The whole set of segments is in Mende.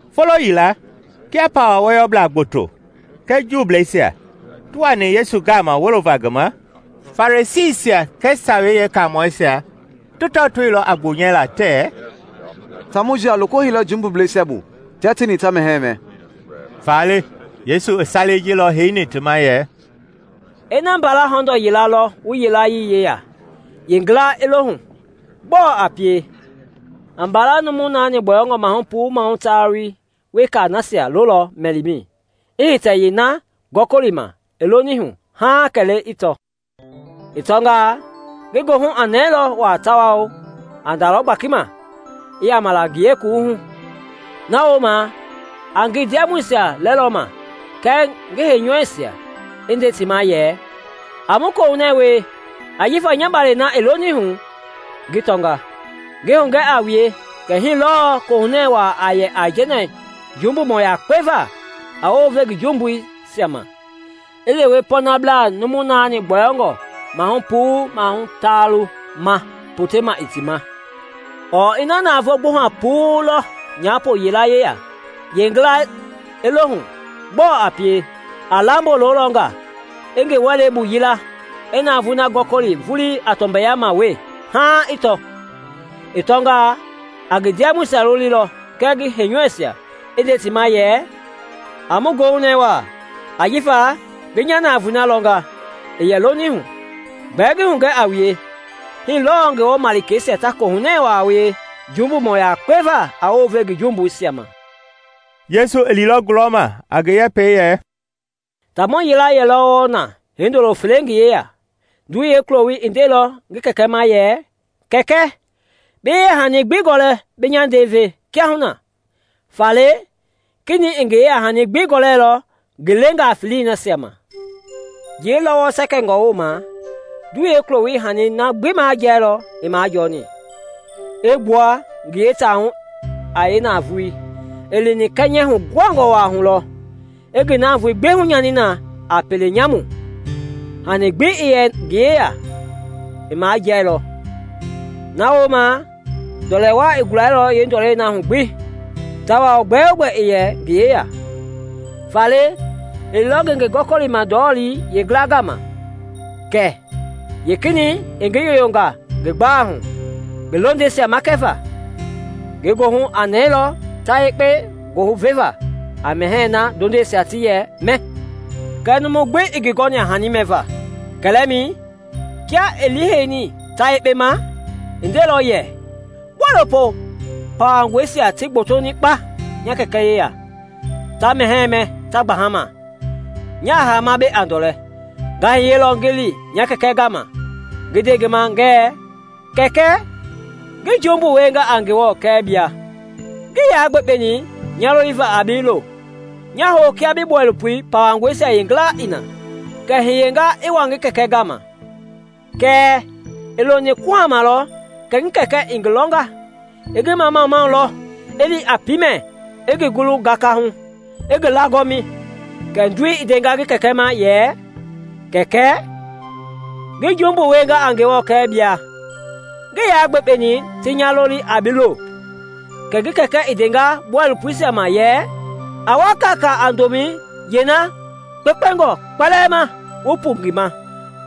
Folo yila, kia pawa wɔyɔblaa gboto kɛɛ jumbubleisia ti wani Yesu gama wolova ngi ma, Farisiisia kɛɛ Sawei Yeekaamɔisia ti tɔtoilɔ a gbonyɛlaa tɛɛ, “Taamɔi ji a loko heilɔ jumbubleisia bu tia tieni ta mɛhɛɛ mɛ!” Faale Yesu i salei ji lɔ heini ti ma yɛ, “Ina mbala hɔndɔɔ yila lɔ wu yilayee yeya, yeengila i lohu, gbɔɔ a pie? A mbala numu naani gbɔyɔngɔ mahu puu mahu taalu wekei nasia lolɔ mɛlimɛi, i hitɛ yeena gɔkɔlima i lonihu haaŋ kɛlee i tɔ. I tɔngaa, ngi goohu a nɛɛlɔ wa tawao a ndalɔ gbakima, i yama la ngie kuwuhu. Na wooma a ngi ndiamɔisia lɛlɔma kɛɛ ngi heinyɔuisia i nde ti ma yɛ, ‘A mu kohunɛ wie ajifa nya balɛi na i lonihu, ngi tɔnga.’ Ngi hugɛ a wue kɛ hii lɔɔ kohunɛ wa a yɛ aijɛnɛ jumbumɔ yakpe va a wounve ngi jumbuisia ma i lewe pɔɔnablaa numu naani gbɔyɔngɔ mahu puu mahu taalu ma potema ii ti ma. “Ɔɔ ina navoo gbuha puu lɔ nyapo yila yeya, yeengila i lohu, gbɔɔ a pie? A lamboi lolɔ nga, i ngi wɛlei bu yila, i navoei na gɔkɔli vulii a tɔmbɛyama wee haaŋ i tɔ. I tɔngaa, a ngi ndiamɔisia lolilɔ kɛɛ ngi heinyɔuisia, i nde ti ma yɛ, ‘A mu goohunɛɛ wa ajifa ngi nya navoei na lɔnga i yɛ lonihu!’ Gbɛɛ ngi hugɛ a wue, hii lɔɔ Ngewɔ malikeisia ta kohunɛ wa wie jumbumɔ yakpe va a wounve ngi jumbuisia ma.” Yesu i liilɔ gulɔma a ngi yɛpɛi yɛ, “Taamɔ yila yɛlɔ wɔɔ na hindolo fele ngi yeya. Ndoi yeekuloi i ndeilɔ ngi kɛkɛ ma yɛ, ‘Kɛkɛ, bi yeyahani gbi gɔlɛ bi nya ndɛi ve kiahuna.’ Faale kenɛi i ngi yeyahanii gbi gɔlɛilɔ ngi leengaa feleisia ma. Njii-lɔwɔ sɛkɛngɔ wooma, ndoi yeekuloi i hani na gbi majiɛilɔ i majɔni, i gbua ngi yeitahu a yeenavoei. I lini kɛnyɛ huguhangɔ wa hu lɔ, i ngi navoei gbi hunyani na a pele nyamu. Hani gbi i yɛ ngi yeya i majiɛilɔ. Na wooma ndɔlɛ wa i gulailɔ yeendɔlei na hu gbi, tawao gbɛogbɛ ii yɛ ngi yeya. Faale i liilɔ ngenge gɔkɔlima ndɔlɔ-lii yeengila gama, kɛ yeekenɛi i ngi yoyonga ngi gbalei hu ngi londɛngɛisia makɛva. Ngi goohu aa nɛɛlɔ ta yekpe gooveva a mɛhɛɛ na ndondɛngɛisia ti yɛ mɛ, kɛɛ numu gbi ii ngi gɔni a hani mɛva. Kɛlɛmɛi, kia i liiheini ta yekpe ma, i ndeilɔ yɛ, ‘Bɔilopo pawangɔisia ti gbotoni kpa nya kɛkɛ yeya, ta mɛhɛɛ mɛ ta gbaha ma, nya hama mbei a ndɔlɛ! Nga hiyelɔ ngi li nya kɛkɛ gama ngi nde ngi ma ngɛɛ, “Kɛkɛ, ngi jumbu wienga a Ngewɔ kɛɛ bia; ngii ya gbekpeni nya loliva a bi lo; nya hou kia bi bɔilopo pawangɔisia yeengila i na.” ’ Kɛ i hiyenga i wa ngi kɛkɛ gama. “Kɛɛ i loni kuhama lɔ kɛ ngi kɛkɛ i ngi lɔnga, i ngi mamamau lɔ, i li a piimɛ, i ngi gulu gakahu, i ngi laagɔmi. Kɛ ndoi i ndenga ngi kɛkɛ ma yɛ, ‘Kɛkɛ, ngi jumbu wienga a Ngewɔ kɛɛ bia; ngii ya gbekpeni ti nya loli a bi lo.’ Kɛɛ ngi kɛkɛ i ndeilɔ bɔilopoisia ma yɛ, ‘A wa kaakaa a ndomɛi yeena kpekpengɔ kpɛlɛɛ ma wu pu ngi ma,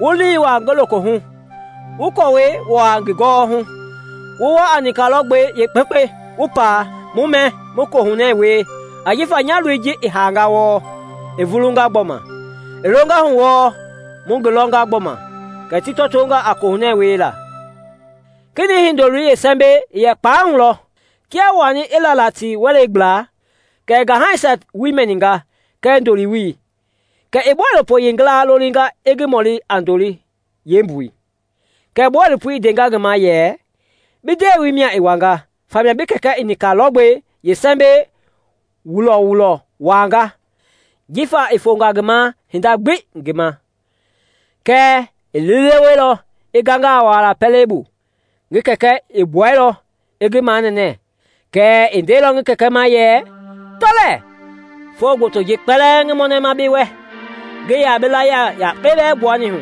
wu liŋ wua ngi lokohu, wu kɔɔwɛi wua ngi gɔwɔhu; wu wa a nika lɔgbɛi yeekpekpe, wu paa, mu mɛ mu kohunɛ wie; ajifa nya loi ji i hanga wɔɔ, i vulunga gbɔma, i longahu wɔɔ, mu ngi lɔnga gbɔma.’ Kɛ ti tɔtonga a kohunɛ wiela. “Kenɛi hindoloi yeesɛmbɛi i yɛ kpalei hu lɔ; kia i wani i lala ti wɛlei gbla, kɛ i ngaihanisia woo mɛninga kɛɛ ndoliwoi. Kɛ i bɔilopoi yeengila lolinga i ngi mɔli a ndoli yeembui. Kɛ bɔilopoi i ndenga ngi ma yɛ, ‘Bi ndewei mia i wanga, famia bi kɛkɛ i nika lɔgbɛi yeesɛmbɛ wulɔwulɔ wanga, jifa i fonga ngi ma hinda gbii ngi ma.’ Kɛɛ i liileweilɔ, i ganga a wualaa pɛlei bu. Ngi kɛkɛ i gbuɛilɔ i ngi manɛnɛ, kɛɛ i ndeilɔ ngi kɛkɛ ma yɛ, ‘Tɔ lɛɛ, foo gbotoi ji kpɛlɛɛ ngi mɔnɛma bi wɛ, ngii ya bi layie yakpe bɛɛ gbuani hu;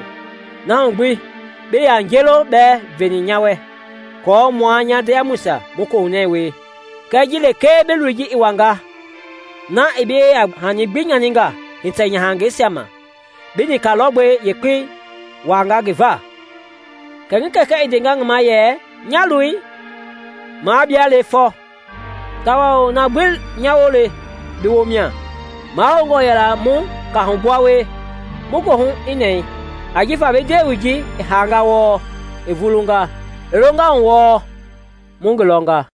na hu gbi bii yaa nje-loo bɛɛ veni nya wɛ kɔɔ mua nya ndiamɔisia mu kohunɛ wie. Kɛɛ ji lekee bi loi ji i wanga, na i bi yeyahani gbi nyaninga hitɛ-nyahangɛisia ma, bi nika lɔgbɛ yekpe wanga ngi va!’ Kɛ ngi kɛkɛ i ndenga ngi ma yɛ, ‘Nya loi, mua bie le fɔ, tawao na gbi nya woo le, bi woo mia. Mahoungɔ yɛla mu kahugbua wie, mu goohu i nɛɛ, ajifa bi ndewei ji i hanga wɔɔ, i vulunga, i longahu wɔɔ, mu ngi lɔnga.’”